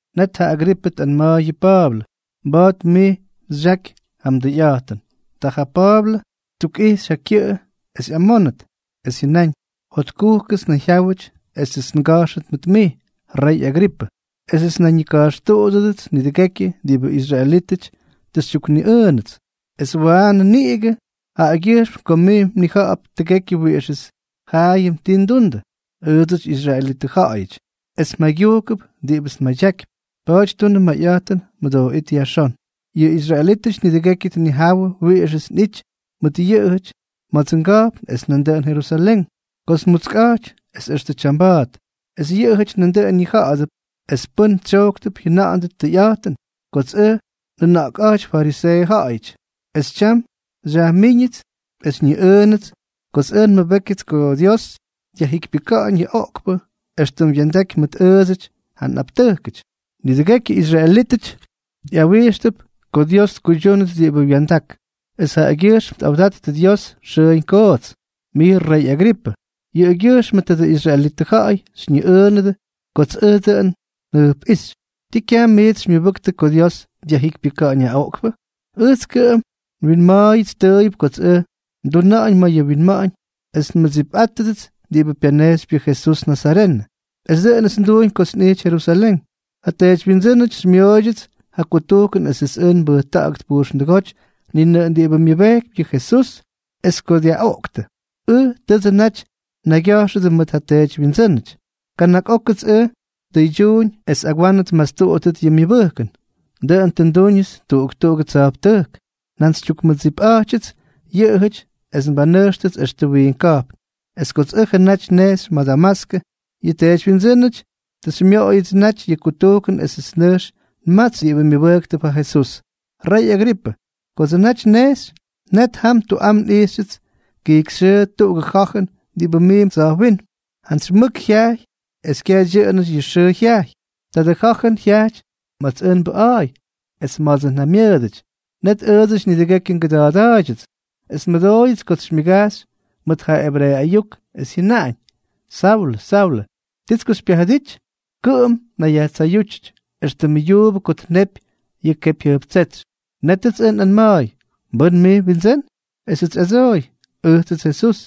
Net ja Agripʉ tꞌanma̱a̱y yʉ Pa̱a̱blʉ: —Mba̱a̱t mij xyaky ja mdʉyꞌa̱jtʉn. Ta ja Pa̱a̱blʉ ttukꞌixy ja kyʉꞌʉ es ꞌyamóndʉt, es jyʉnáñ: —Jotkujkʉts nnayjyáwʉty esʉts nga̱jxʉt mʉt mij, rey Agripʉ, esʉts nnayñika̱jxtuꞌudʉdʉts nidʉgekyʉ diꞌibʉ israelítʉty tʉ xytyukniꞌʉʉnʉts, es waanʉ niꞌigʉ jaꞌagyʉjxm ko mij mnija̱ꞌa̱p tʉgekyʉ wiꞌixʉts jaayʉm tii ndundʉ, ʉʉdsʉty israelitʉ ja̱ꞌa̱yʉty, es mjaygyujkʉp diꞌibʉts nmadyakypy. Pa̱a̱ty tunʉ mayꞌa̱jtʉn, mʉdooꞌít yajxón. ’Yʉ israelítʉty nidʉgekyʉ tnijawʉ wiꞌixʉts nꞌijty mʉt yʉꞌʉjʉty ma̱dsʉ nga̱jpn es nandʉꞌʉn Jerusalén, kots nmutskꞌa̱jty es extʉ tyamba̱a̱t. Es yʉꞌʉjʉty nandʉꞌʉn ñija̱ꞌa̱dʉp, es pʉn tsyojktʉp jyʉna̱ꞌa̱ndʉt tʉyꞌa̱jtʉn, kots ʉj nꞌʉna̱ꞌkꞌa̱jty fariseeʉ ja̱ꞌa̱yʉty. Es tyam xyajmíñʉts es xyñiꞌʉʉnʉts kots ʉj nmʉbékyʉts ko Dios dyajjikypyʉka̱ꞌa̱ñ yʉ oꞌkpʉ éxtʉm wya̱ndaky mʉt ʉʉdsʉdyʉ nꞌaptʉjkʉty. Nidʉgekyʉ israelítʉty ꞌyawijxtʉp ko Dios tkuydyúnʉt diꞌibʉ wya̱ndak, es jaꞌagyʉjxm tꞌawdattʉ Dios xʉʉñ koots. Mij rey Agripʉ, yʉꞌʉgyʉjxmʉ tadʉ israelitʉ ja̱ꞌa̱y xyñiꞌʉʉnʉdʉ kots ʉj dʉꞌʉn njʉjpꞌíxy. ¿Ti kyaj miits xymyʉbʉktʉ ko Dios dyajjikypyʉka̱ꞌa̱ñ ja oꞌkpʉ? ’Ʉjts kʉꞌʉm nwinma̱a̱yʉts tʉʉyʉp kots ʉj nduna̱ꞌa̱ñ mayʉ winma̱ꞌa̱ñ es nmʉdsipꞌátʉdʉts diꞌibʉ pyanejxypy yʉ Jesús nazarenʉ. Es dʉꞌʉnʉts nduuñ kots nꞌijty Jerusalén. Ja teedywyindsʉ́nʉty xymyooydyʉts ja kutujkʉn esʉts ʉj nbʉjta̱ꞌa̱gʉt pujxndʉgóty ni nʉꞌʉn diꞌibʉ myʉbejkypy yʉ Jesús; es ko dyaꞌoꞌktʉ, ʉj tʉdsʉ naty nnaygya̱jxʉdʉ mʉt ja teedywyindsʉ́nʉty. Kana̱k ókʉts ʉj ndʉydyuuñ es agwanʉ tmastuꞌudʉt yʉ myʉbʉjkʉn. Dʉꞌʉn tʉ ndúñʉts tuꞌuk tuꞌugʉ tsa̱jptʉjk. Njantsytyukmʉdsipꞌa̱jtyʉts yʉꞌʉjʉty es nbanʉjxʉts extʉ wiink ka̱jpn. ’Es kots ʉjʉ naty nnejxy ma̱ Damaskʉ, yʉ teedywyindsʉ́nʉty tʉ xymyoꞌoyʉts yʉ kutujkʉn esʉts nʉjx nmatsy diꞌibʉ myʉbʉjktʉp ja Jesús. Rey Agripʉ, kotsʉ naty nnejxy, net jam tuꞌam nꞌijxyʉts kijkyxyʉʉ tuꞌugʉ ja̱jʉn diꞌibʉ miimp tsa̱jwínm. Jantsy mʉk jyajy es kyaj dyʉꞌʉnʉty yʉ xʉʉ jyajy. Tadʉ ja̱jʉn jyajty ma̱ts ʉj nbʉꞌa̱a̱y es ma̱dsʉ nja̱ymyʉʉdʉty. Net ʉʉdsʉty nidʉgekyʉ ngʉda̱a̱da̱a̱ydyʉts, es nmʉdooyʉts kots xymyʉgajxy mʉt ja ebreeʉ ayuk, es jyʉnaꞌañ: “Saulʉ, Saulʉ, ¿tits ko xypyajʉdity? Kʉꞌʉm mnayyajtsayútyʉty, éxtʉmʉ yuubʉ ko tnepy yʉ kepyjyʉjptsétsy.” Nétʉts ʉj nꞌanma̱a̱y: “¿Mbʉ́n mij?, Windsʉ́n.” Esʉts xyꞌadsooy: “Ʉjtsʉts Jesús,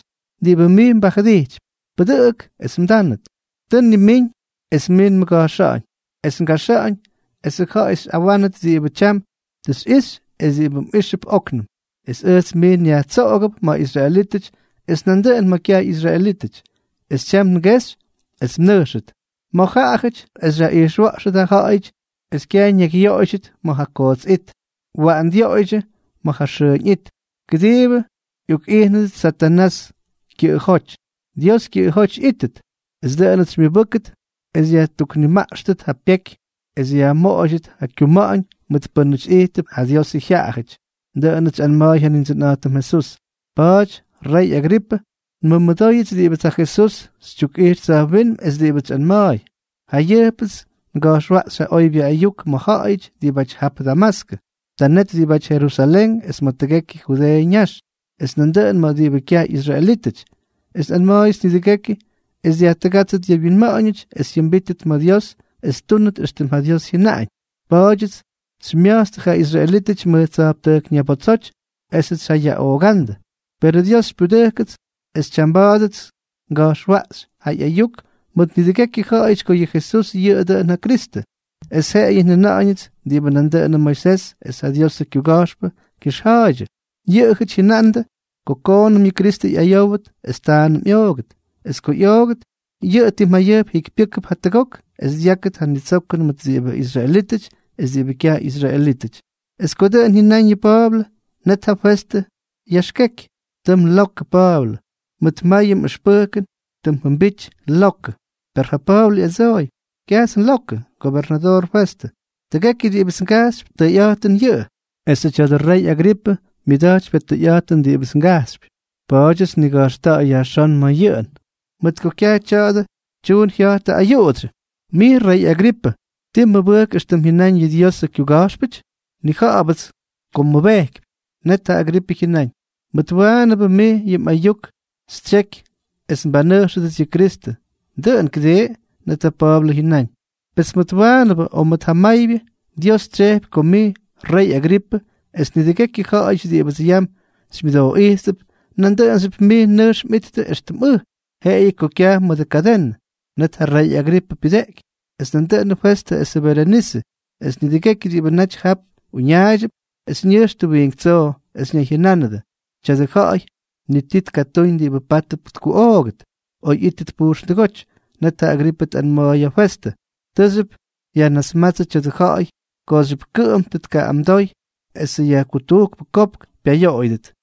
diꞌibʉ mij mbajʉdijtypy. Pʉdʉꞌʉk es mdánʉt. Tʉ nnimíñ es mij nmʉga̱jxa̱ꞌa̱ñ es ngajxa̱ꞌa̱ñ esʉ ja̱ꞌa̱y xyꞌawánʉt diꞌibʉ tyam tʉ xyꞌixy es diꞌibʉ mꞌíxʉp óknʉm. Es ʉjts mij nyajtsoꞌogʉp ma̱ israelítʉty es nandʉꞌʉn ma̱ kyaj ꞌyisraelítʉty. Es tyam ngexy es mnʉjxʉt ma̱ jaꞌajʉty es xyaꞌijxwa̱ꞌxʉt ja ja̱ꞌa̱yʉty es kyaj ñakyyoꞌoydyʉt ma̱ ja koots it, waꞌan dyoꞌoydyʉ ma̱ ja xʉʉñ it, kʉdiibʉ ꞌyokꞌijnʉdʉt Satanás kyʉjoty, Dios kyʉꞌʉjóty ꞌyíttʉt; esʉ dʉꞌʉnʉts xymyʉbʉ́ktʉt es yajtuknimaꞌkxtʉt ja pyeky es yajmoꞌoydyʉt ja kuma̱ꞌa̱ñ mʉt pʉ́nʉty ijttʉp ja Diosʉ jyaꞌayʉty.” Dʉꞌʉnʉts xyꞌanma̱a̱y ja Nindsʉnꞌa̱jtʉm Jesús. ’Pa̱a̱ty, rey Agripʉ, nmʉmʉdooyʉts diꞌibʉts ja Jesús xytyukꞌijx tsa̱jwínm es diꞌibʉts xyꞌanma̱a̱y. Jayʉjpts nga̱jxwaꞌxy ja oybyʉ ayuk ma̱ ja̱ꞌa̱yʉty diꞌibáty jap Damaskʉ, ta net diꞌibáty Jerusalén es ma̱ tʉgekyʉ Judeeʉ ñax, es nandʉꞌʉn ma̱ diꞌibʉ kyaj ꞌyisraelítʉty; es nꞌanma̱a̱yʉts nidʉgekyʉ es dyajtʉgátstʉt yʉ wyinma̱ꞌa̱ñʉty es jyʉmbíttʉt ma̱ Dios es ttúnʉt éxtʉm ja Dios jyʉnaꞌañ. Pa̱a̱dyʉts xymya̱jtstʉ ja israelítʉty mʉj tsa̱jptʉjk ñabotsoty esʉts xyjayaꞌoogándʉ. Perʉ Dios xypyudʉjkʉts es tyamba̱a̱dʉts nga̱jxwaꞌxy ja ꞌyayuk mʉt nidʉgekyʉ ja̱ꞌa̱yʉty ko yʉ Jesús yʉꞌʉ dʉꞌʉn ja Kristʉ. Es jeꞌeyʉ njʉna̱ꞌa̱ñʉts diꞌibʉ nandʉꞌʉnʉ Moisés es ja Diosʉ kyuga̱jxpʉ kyʉxja̱a̱ydyʉ. Yʉꞌʉjʉty jyʉnandʉ ko koonʉm yʉ Kristʉ ꞌyayówʉt es taanʉm ꞌyoogʉt; es ko ꞌyoogʉt, yʉꞌʉ tim jayʉjp jikypyʉ́kʉp jatʉgok es dyákʉt ja nitsokʉn mʉt diꞌibʉ israelítʉty es diꞌibʉ kyaj ꞌyisraelítʉty. Es ko dʉꞌʉn jyʉnáñ yʉ Pa̱a̱blʉ, net ja Festʉ yaxkeky: —¡Tʉ mlokʉ, Pa̱a̱blʉ! Mʉt mayʉ mꞌʉxpʉjkʉn tʉ mjʉmbity lokʉ. Per ja Pa̱a̱blʉ ꞌyadsooy: —Kyajts nlokʉ, gobernadoor Festʉ. Tʉgekyʉ diꞌibʉts ngajxypy, tʉyꞌa̱jtʉn yʉꞌʉ. Esʉ tya̱dʉ rey Agripʉ myʉda̱jtypy ja tʉyꞌa̱jtʉn diꞌibʉts ngajxypy, pa̱a̱dyʉts nniga̱jxta̱ꞌa̱y yajxón ma̱ yʉꞌʉn, mʉt ko kyaj tya̱a̱dʉ tyuun jya̱jtʉ ayuꞌudsyʉ. Mij, rey Agripʉ, ¿tii mmʉbʉjk éxtʉm jyʉnáñ yʉ Diosʉ kyuga̱jxpʉty? Nnija̱ꞌa̱bʉts ko mmʉbejkypy. Net ja Agripʉ jyʉnáñ: —Mʉt waanʉbʉ mij yʉ mꞌayuk xytsyeky es nbanʉjxʉdʉts yʉ Jesukristʉ, dʉꞌʉn, ¿kʉdii? Net ja Pa̱a̱blʉ jyʉnáñ: —Pes mʉt jawaanʉbʉ o mʉt jamaybyʉ, Dios tsyejpy ko mij, rey Agripʉ, es nidʉgekyʉ ja̱ꞌa̱yʉty diꞌibʉts yam xymyʉdooꞌijttʉp, nandʉꞌʉnxyʉp mij nʉjx mꞌittʉ éxtʉm ʉj, jeꞌeyʉ ko kyaj mʉdʉ kadenʉ. Net ja rey Agripʉ pyʉdeꞌky, es nandʉꞌʉnʉ Festʉ esʉ Berenise, es nidʉgekyʉ diꞌibʉ naty jap uñaaydyʉp, es ñʉjxtʉ wiink tsoo, es ñayjyʉnánʉdʉ: —Tya̱dʉ ja̱ꞌa̱y ni ti tʉ tkatúñ diꞌibʉ pátʉp tkuꞌoogʉt o ꞌyítʉt pujxndʉgóty. Net ja Agripʉ tꞌanma̱a̱y ja Festʉ: —Tʉʉxyʉp yajnasmátsʉ tya̱dʉ ja̱ꞌa̱y kooxyʉp kʉꞌʉm tʉ tkaꞌꞌamdoy esʉ yajkutujkpʉ kopk pyayoꞌoyʉdʉt.